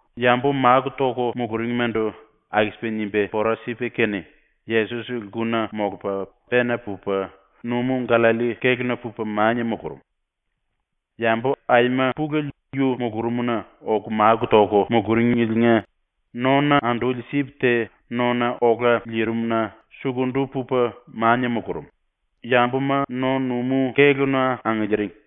Yambu máku toku muluringmandu aku-sipa nimba pora sipa kene, Yesos lkuna molupa pena pupa numú-⸤Gallalli⸥ kéluna pupa mania mulurum. Yambu aima pulele yu mulurumna oku máku toku muluringeliinga nona anduli sip te nona ola lirim-na sukundu pupa mania mulurum, yambuma no-numú kéluna angiliiring.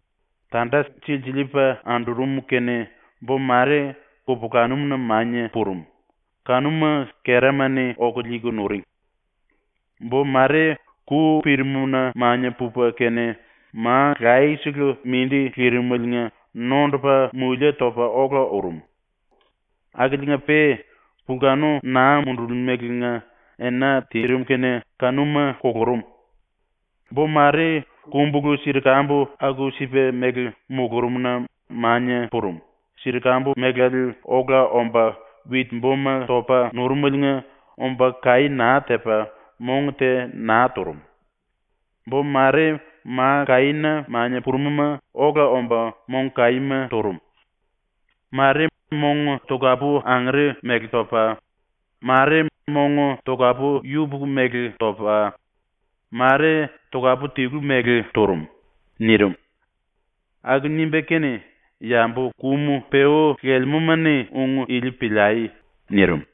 Tanda silsiliipa andurum kene bo mare kupulanum-na mania purum, kanuma kerama-ni oku liiku nuring. Bo mare ku pirimna mania pupa kene ma laye-sele mindi lirimeliinga nondupa mulie topa ola urum. Akiliinga-pe pulkanu naa mundurumeliinga ena tirim kene kanuma kulurum. Bo mare kumbulu-sirkambu aku-sipa mele mulurumna mania purum, sirkambu melale ola omba wit-boma topa nurumeliinga omba kaí naa tepa ⸤mong te naa turum⸥. Bo mare ma kaína mania purum-ma ola omba mong kaíma turum. Mare mong tokapu-angere mele topa, mare mong tokapu-yupuku mele topa, mare tokapu-tilu mele turum.” ⸤nirim.⸥ ⸤Aku nimba kene⸥ “Yambu kum-peú lelemúma-ni ung ili piliai.” nirim.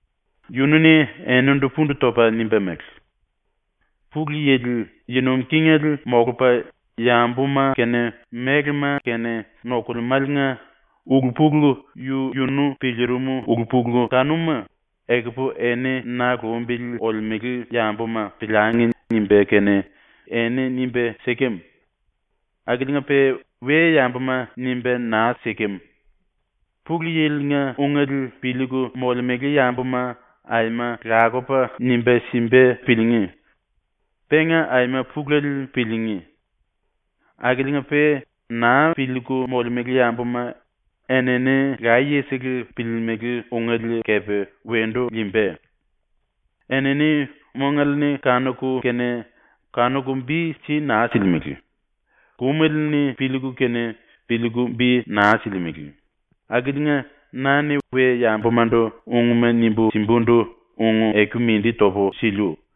Yunu-ni eninindu pundu topa nimba mele: “Pulu Yili yi nuim kingele molupa yambuma kene mélema kene nokulemáliinga ulu-pulu yu-yunu piliirim ulu-pulu kanuma ‘Ekupu eni ⸤na lumbili olemele yambuma⸥ piliangi.’ nimba kene eni nimba sikem. Akiliinga-pe we-yambuma nimba naa sikem. Pulu Yili-nga ungele piliiku molemele yambuma aima lakupa nimba simba piliingí. Penga aima pulele piliingí. Akiliinga-pe naa piliiku molemele yambuma enini layesele piliilimili ungele kepe wendu liimba. ‘Enini mongale-ni kanuku kene kanuku bi si naa silimele; kumele-ni piliiku kene piliiku bi naa silimele.’ akiliinga na-ni we-yambumandu ungma nimbu simbundu ung-eku mindi topu siliu.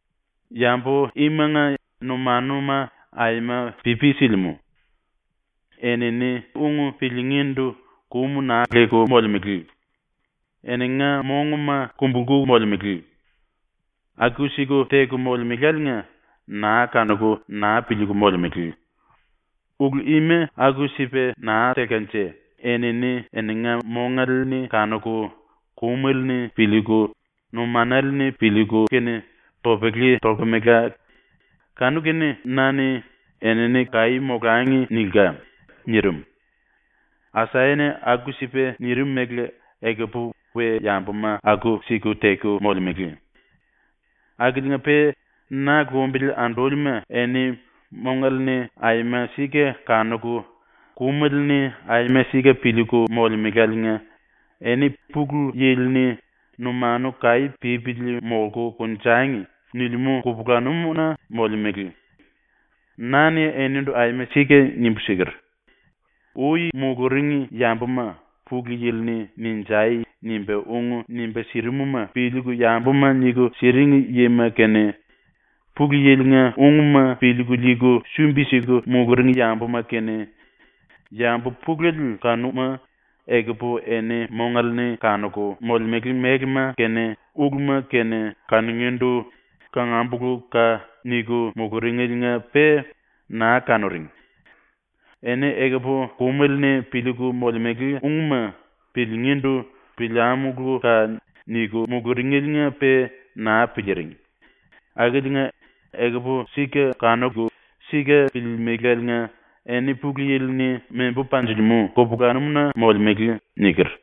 Yambu imanga numanuma aima pipi silimú; enini ung piliingíndu kum naa leku molemele; eninga monguma kumbulku molemele. Aku-siku teku molemeláliinga naa kanuku naa piliiku molemele. Ulu ima aku-sipa naa telkanje enini eninga mongale-ni kanuku kumele-ni piliiku numanale-ni piliiku kene topele tolkemela, kanu-kene na-ni ‘Enini kaí molangi.’ nilka.” nirim. ⸤Asaya-ni aku-sipa nirim mele⸥ ekupu we-yambuma aku-siku teku molemele. “Akiliinga-pe ⸤na lumbili andúlima⸥ eni mongale-ni aima sika kanuku kumele-ni aima sika piliiku molemeláliinga eni Pulu Yili-ni “Numanu kaí pípili molku konjangi.” nilimú kupulanum-na molemele. Na-ni enindu aima sika nimbu siker: “Ui muluring yambuma, Pulu Yili-ni “Ninjai!” nimba ung nimba sirimuma piliiku yambuma niku siring yima kene, Pulu Yili-nga ungma piliiku liiku sumbi-siku muluring yambuma kene, yambu pulele kanuma ekupu eni mongale-ni kanuku molemele mélema kene uluma kene kanungíndu “Kanámuluka!” niku muluringeliinga-pe naa kanuring. Eni ekupu kumele-ni piliiku molemele ungma piliingíndu “Piliámuluka!” niku muluringeliinga-pe naa piliiring, akiliinga ekupu sika kanuku sika piliilimiléliinga eni Pulu Yili-ni membu panjilimú kupulanum-na molemele.” niker.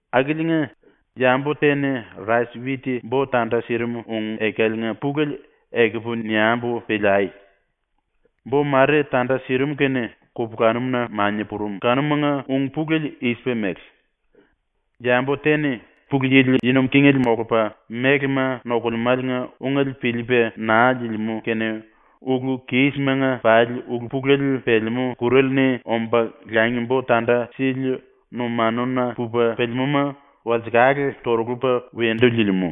“Akiliinga, yambu te-ni rais-wit bo tanda sirim ung-ekaliinga pulele ekupu niambu piliai. Bo mare tanda sirim kene kupulanum-na mania purum kanumanga ⸤ung-pulele i-sipa mele:⸥ Yambu te-ni Pulu Yili yi nuim kingele molupa mélema nokulemáliinga ungele piliipa naa liilimú kene ulu-kísimanga pali ulu-pulele pelemú ⸤kur⸥ ale-ni omba langi-bo tanda sili numanuna pupa pelemúma walsekale torulupa wendu liilimú.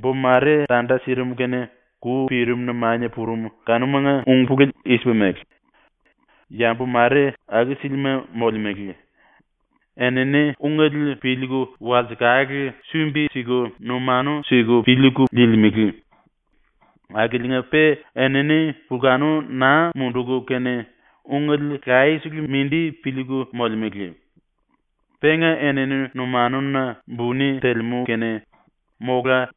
Bo mare tanda sirim kene ku pirimna mania purum kanumanga ⸤ung-pulele i-sipa mele:⸥ Yambu mare aku-sílima molemele. Enini ungele piliiku walsekale sumbi-siku numanu siku piliiku liilimele. Akiliinga-pe enini pulkanu naa munduku kene ungele layesele mindi piliiku molemele. Penga enini numanuna buni telemú kene mola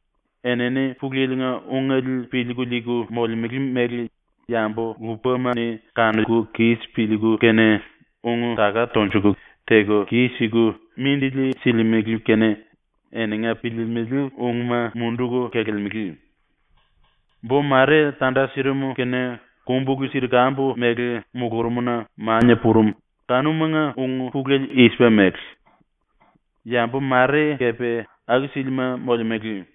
enini Pulu Yili-nga ungele piliiku liiku molemele mele yambu lupama-ni kanuku kis piliiku kene ung-taka tonjuku teku kis-siku mindili silimele kene eninga piliilimili ungma munduku kelelemele. Bo mare tanda sirim kene kumbulu-sirkambu mele mulurumna mania purum kanumanga ⸤ung-pulele i-sipa mele:⸥ Yambu mare kepe aku-sílima molemele.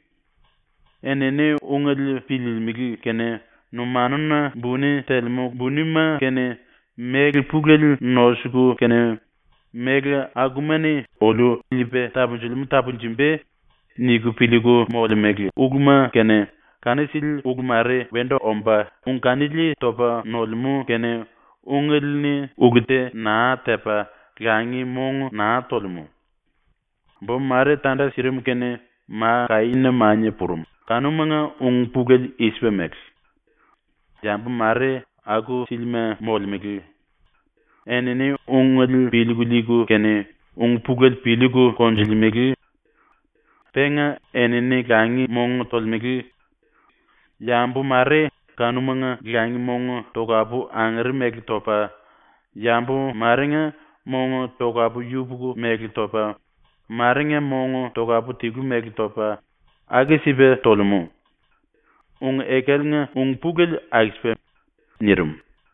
Enini ungele piliilimili kene numanuna buni telemú bunima kene, méle pulele nosuku kene ‘Méle akuma-ni oliu liipa tapunjilimú tapunjumba.’ niku piliiku molemele uluma kene, kanu sili ulu mare wendu omba ung kanili topa nolemú kene ungele-ni ulu te naa tepa langi mong naa tolemú. Bo mare tanda sirim kene ma kaína mania purum ⸤kanumanga ung-pulele i-sipa mele:⸥ Yambu mare aku-sílima molemele. Enini ungele piliiku liiku kene ung-pulele piliiku konjulemele. Penga enini langi mong tolemele. Yambu mare kanumanga langi mong tokapu-angere mele topa, yambu marenga mong tokapu-yupuku mele topa, marenga mong tokapu-tilu mele topa, aku-sipa tolemú. ⸤Ung-ekaliinga ung-pulele aku-sipa.⸥” nirim.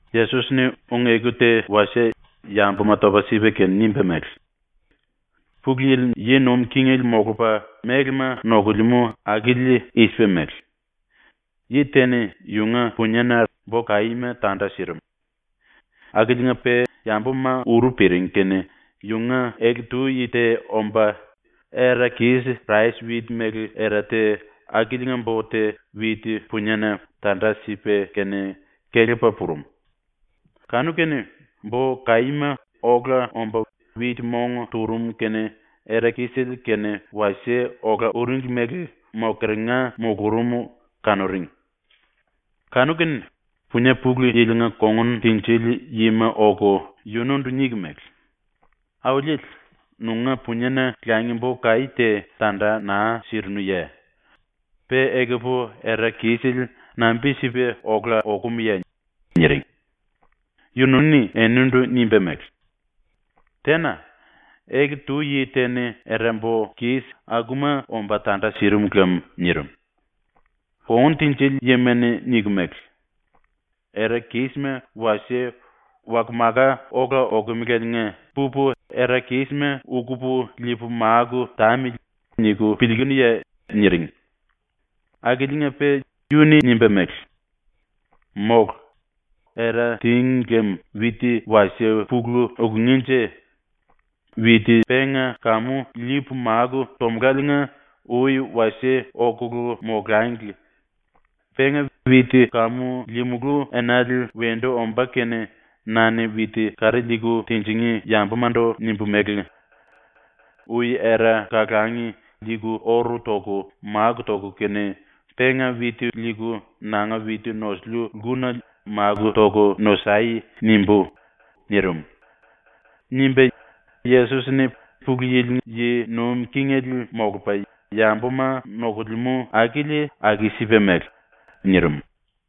Yesos-ni ung-eku te wasie yambuma topa sipa kene nimba mele: “Pulu Yili yi nuim kingele molupa mélema nokulemú akili i-sipa mele: Yi te-ni yunga puniena rais-wit bo kaíma tanda sirim. Akiliinga-pe yambuma uru piring kene yunga ele-tu yi te omba era-kis ⸤rais-wit mele era te⸥ akiliinga bo te wit-puniena tanda sipa kene kelepa purum. Kanu-kene bo kaíma ola omba wit-mong turum kene era-kisele kene wasie ola uringli mele mokeringa mulurum kanuring. Kanu-kene punie pulu yilinga kongun tinjili yima oku yunundu niku mele: “Auliele, nunga puniena langi-bo kaí te tanda naa sirinuye? Pe ekupu era-kisele nambi-sipa ola okumuye?” niring. Yunu-ni eninindu nimba mele: “Tena. Ele-tu yi te-ni era-bo kis akuma omba tanda sirim lam.” nirim. Kongun tinjili yima-ni niku mele: “‘Era-kísima wasie waka-maka ola okumeleliinga pupu era-kísima ukupu liipu máku tamili.’ niku piliikunuye?” niring. Akiliinga-pe yunu-ni nimba mele: “Mólu. Era tíngi lem wit wasie pulu ukungínje. Penga kamu wit liipu máku tomuláliinga ui wasie okulu molangli. Penga wit kamu liimulú enale wendu ombá kene na-ni wit kari leku linjingí yambumandu nimbu mele: “Ui era kalangi liiku oru toku máku toku kene, penga wit liiku nanga wit nosiliu lkuna máku toku nosai.” nimbú.” nirim.” nimba, Yesos-ni “Pulu Yili yi nuim kingele molupa yambuma nokulemú akili aku-sipa mele.” nirim.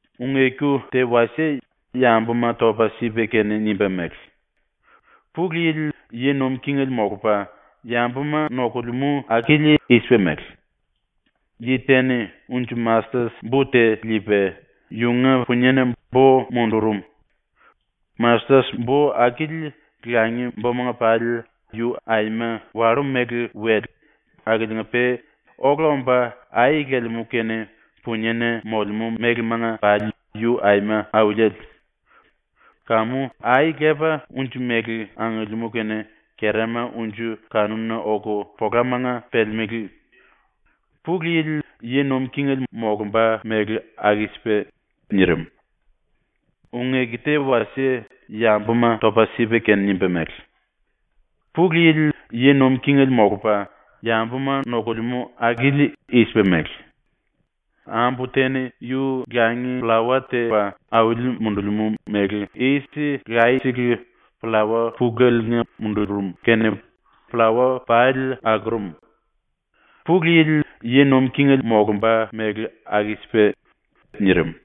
Ung-eku te wasie yambuma topa sipa kene nimba mele: “Pulu Yili yi nuim kingele molupa yambuma nokulemú akili i-sipa mele: Yi te-ni unji-mastet bo te liipa yunga puniena bo mundurum. Mastet-bo akili langi-bomanga pali yu aima wallú-mele-wele akiliinga-pe ola omba ai lelemú kene puniena molemú mélemanga pali yu aima auliele. Kamu ai lepa unji mele angiliimú kene kerama unji kanuna oku polamanga pelemelé. ⸤Pulu Yili yi nuim kingele molumba mele aku-sipa.⸥” nirim. Ung-eku te wasie yambuma topa sipa kene nimba mele: “Pulu Yili yi nuim kingele molupa yambuma nokulemú akili i-sipa mele: Ambu te-ni yu langi-pllawa tepa auli mundulimú méle yis laye-sele pllawa puleliinga mundurum kene pllawa pali akurum. ⸤Pulu Yili yi nuim kingele molumba mele aku-sipa.⸥” nirim.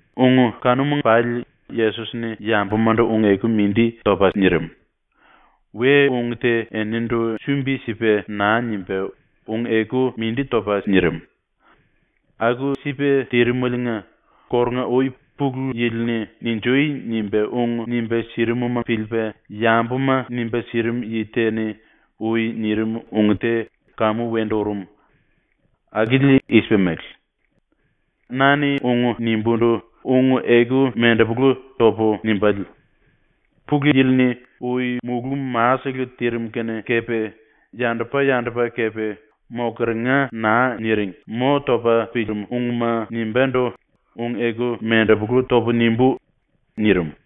Ung kanuma pali Yesos-ni yambumandu ung-eku mindi topa nirim. We-ung te eninindu sumbi-sipa naa nimba ung-eku mindi topa nirim. Aku-sipa tirimeliinga kórunga-ui Pulu Yili-ni “Ninjui!” nimba ung nimba sirimuma piliipa yambuma nimba sirim yi te-ni ui nirim ung te kamu wendu urum. Akili i-sipa mele: “Na-ni ⸤ung nimbúndu⸥ ung-eku ⸤mendepulu⸥ topu nimbále. Pulu Yili-ni ui mulú-masele tirim kene kepe yandupa-yandupa kepe ⸤mokeringa naa niring⸥ mo topa pirim ungma ⸤nimbúndu ung-eku mendepolu topu⸥ nimbú.” nirim.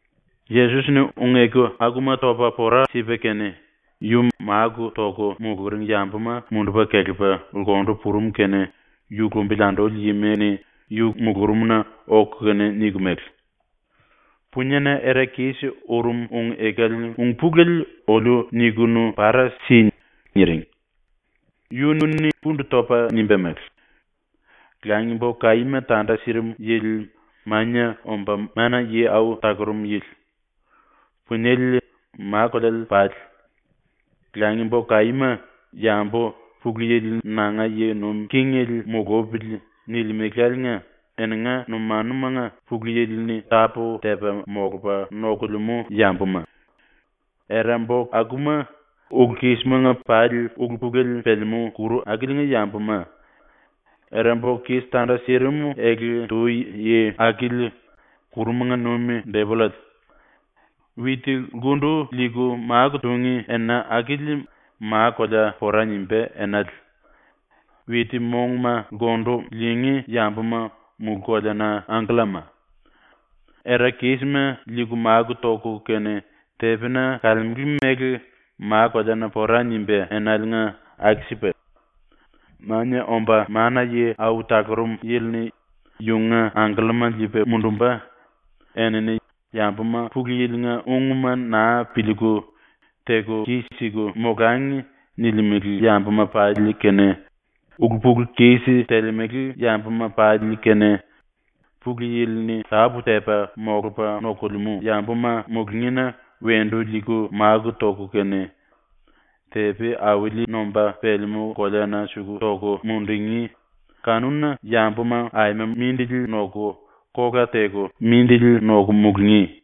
⸤Yesos-ni ung-eku akuma topa pora sipa kene,⸥ yu máku toku muluring yambuma mundupa kelepa lkundu purum kene yu lumbili anduli yima-ni yu mulurumna oku kene niku mele: “Puniena era-kis urum ung-ekaliinga ung-pulele oliu niku para si.” niring. Yunu-ni pundu topa nimba mele: “Langi-bo kaíma tanda sirim yili Mania Omba Mana-Yi Au Talurum Yili. Puniele ma-koleale pali. Langi-bo kaíma yambu ‘Pulu Yili nanga yi nuim kingele mulupili.’ nilimeláliinga eninga numanumanga Pulu Yili-ni tápu-tepa molupa nokulemú yambuma. Era-bo akuma ulu-kísimanga pali ulu-pulele pelemú ⸤kuru⸥ akiliinga yambuma. Era-bo kis tanda sirim ele-tu yi akili ⸤kurumanga nuim⸥ depollale. Wit lkundu liiku máku tungí ena akili ma-kolea pora nimbá enale. Wit-monguma lkundu liingí yambuma mulú-koleana angkellama. “Era-kísima liiku máku toku kene tepina kalemele mele ma-kolea pora nimbá enaliinga aku-sipa. Mania Omba Mana-Yi Au Talurum Yili-ni yunga angkellama liipa mundumba, enini ‘Yambuma Pulu Yili-nga ungma naa piliiku, teku kis-siku molangi.’ nilimele yambuma pali kene, ulu-pulu-kis telemele yambuma pali kene, Pulu Yili-ni tápu-tepa molupa nokulemú yambuma mulungína wendu liiku máku toku kene, tepi auli nomba pelemú koleana suku toku mundungí, kanuna yambuma aima mindili noku kola teku mindili noku mulungí.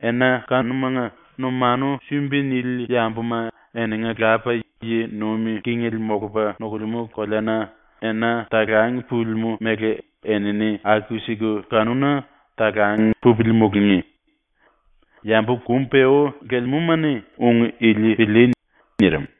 Ena kanuna numanu sumbi nili yambuma eninga Lapa yi nuim kingele molupa nokulemú koleana ena talang pulimú mele enini aku-siku kanuna talang pupili mulungí. “Yambu kum-peú lelemúma-ni ung ili pilíí.” ⸤nirim.⸥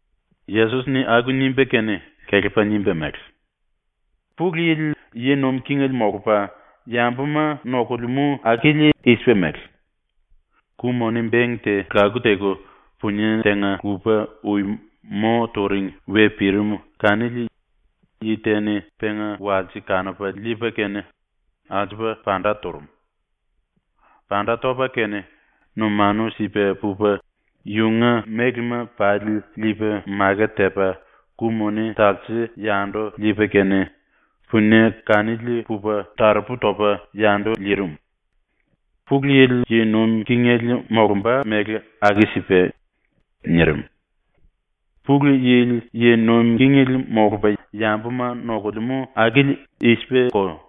⸤Yesos-ni aku nimba kene kelepa nimba mele:⸥ “Pulu Yili yi nuim kingele molupa yambuma nokulemú akili i-sipa mele: Ku-moni beng te laku teku punie tenga-lupa ui mo turing we pirim kanili yi te-ni penga walse kanupa liipa kene alsupa panda turum. Panda topa kene numanu sipa pupa yunga mélema pali liipa maket tepa ku-moni talse yandu liipa kene punie kanili pupa taropu topa yandu liirim. ⸤Pulu Yili yi nuim kingele molumba mele aku-sipa.⸥” ⸤nirim.⸥ “Pulu Yili yi nuim kingele molupa yambuma nokulemú akili i-sipako: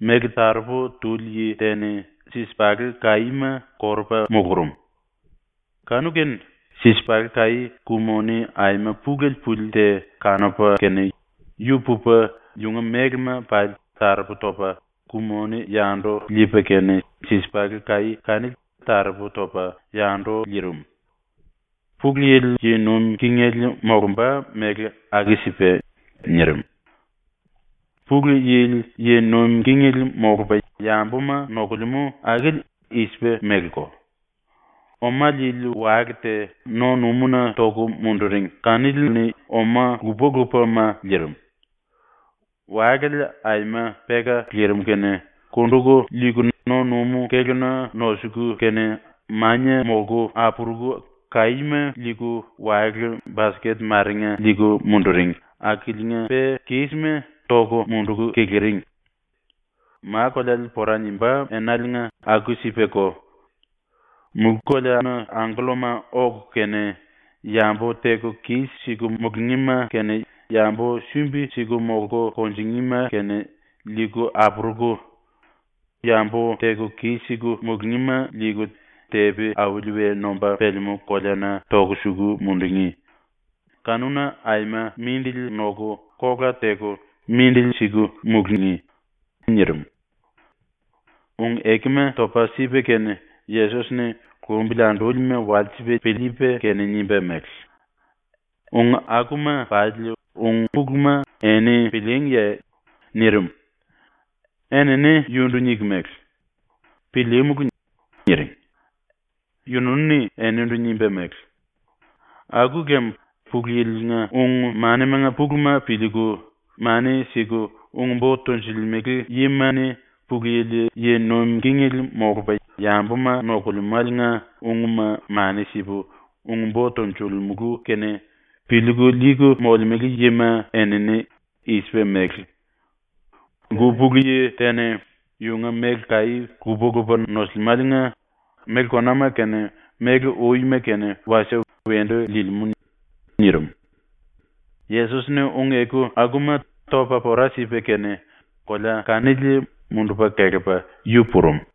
Méle taropu tuli yi te-ni sisipalé-kaíma korupa mulurum. Kanu-kene sisipalé-kaí ku-moni aima pulele puli te kanupa kene, yu pupa yunga mélema pali taropu topa ku-moni yandu liipa kene sisipalé-kaí kanili taropu topa yandu liirim. ⸤Pulu Yili yi nuim kingele molumba mele aku-sipa.⸥” ⸤nirim.⸥ “Pulu Yili yi nuim kingele molupa yambuma nokulemú akili i-sipa meleko: Oma liili wale te no-numúna toku munduring kanili-ni oma lupa-lupama liirim. Walale aima peka lirim kene kunduku liiku no-numú kéluna nosuku kene, mania molku apuruku kaíma liiku wale-basket marenga liiku munduring akiliinga-pe kísima toku munduku kiliring. “Ma-koleale pora nimbá enaliinga aku-sipako: Mulú-koleana angkellama oku kene, yambu teku kis-siku mulungíma kene yambu sumbi-siku molku kunjingíma kene liiku apuruku yambu teku kis-siku mulungíma liiku tepi auli we nomba pelemú koleana toku suku mundungí, kanuna aima mindili noku kola teku mindili siku mulungí.” ⸤nirim.⸥ ⸤Ung-ekuma topa pora sipa kene Yesos-ni lumbili andúlima walsipa piliipa kene nimba mele:⸥ “Ung akuma pali ung-puluma eni pilííngiye?” nirim. Enini yundu niku mele: “Pilíímulu.” niring. Yunu-ni eninindu nimba mele: “Aku lem Pulu Yili-nga ung-manimanga puluma piliiku mani siku ung-bo tonjilimele yima-ni Pulu Yili yi nuim kingele molupa yambuma nokulemáliinga ungma mani sipu ung-bo tonjilimulu kene piliiku liiku molemele yima enini i-sipa mele: Lku pulu yi te-ni yunga méle kaí lupa-lupa nosilimáliinga méle konama kene méle uima kene wasie wendu liilimú.” nirim. Yesos-ni ung-eku akuma topa pora sipa kene kolea kanili mundupa kelepa yu purum.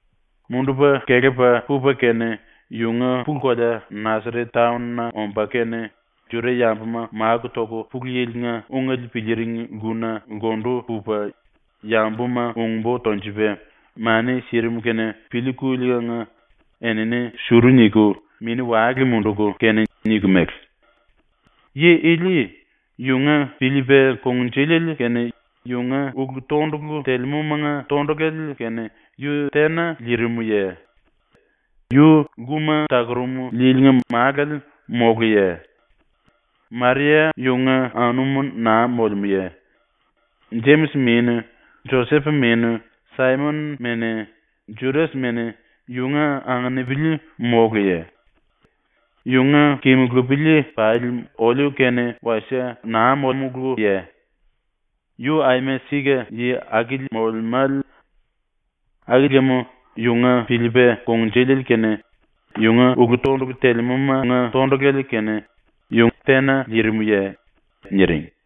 Mundupa kelepa pupa kene yunga pulu-kolea ⸤Nasaret⸥ taon-na omba kene Juda-yambuma máku toku Pulu Yili-nga ungele piliiring lkuna lkundu pupa yambuma ung-bo tonjupa mani sirim kene piliikuliinga enini suru niku mini-wale munduku kene niku mele: “Yi ili yunga piliipa kungnjuliele kene yunga ulu-tondulu telemúmanga tondulale kene yu tena liirimuye? Yu lkuma takurum yilinga málale móluye? Maria yunga anum naa molemúye? Jemis mene, Josep mene, Saimon mene, Judas mene, yunga anginipili móluye? Yunga kimulupili pali oliu kene wasie naa molemuluye? ⸤Yu aima sika yi akili molemále.⸥ Aku lem yunga piliipa kungnjuliele kene yunga ulu-tondulu telemúmanga tondulale kene yu tena liirimuye?” niring.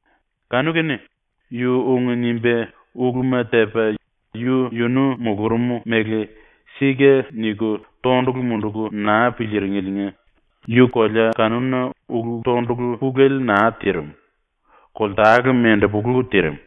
Kanu-kene yu ⸤ung nimba uluma tepa yu-yunu mulurum mele ‘Sika’ niku⸥ tondulu munduku naa piliiringeliinga yu kolea kanuna ulu-tondulu pulele naa tirim, koltale mendepolu tirim.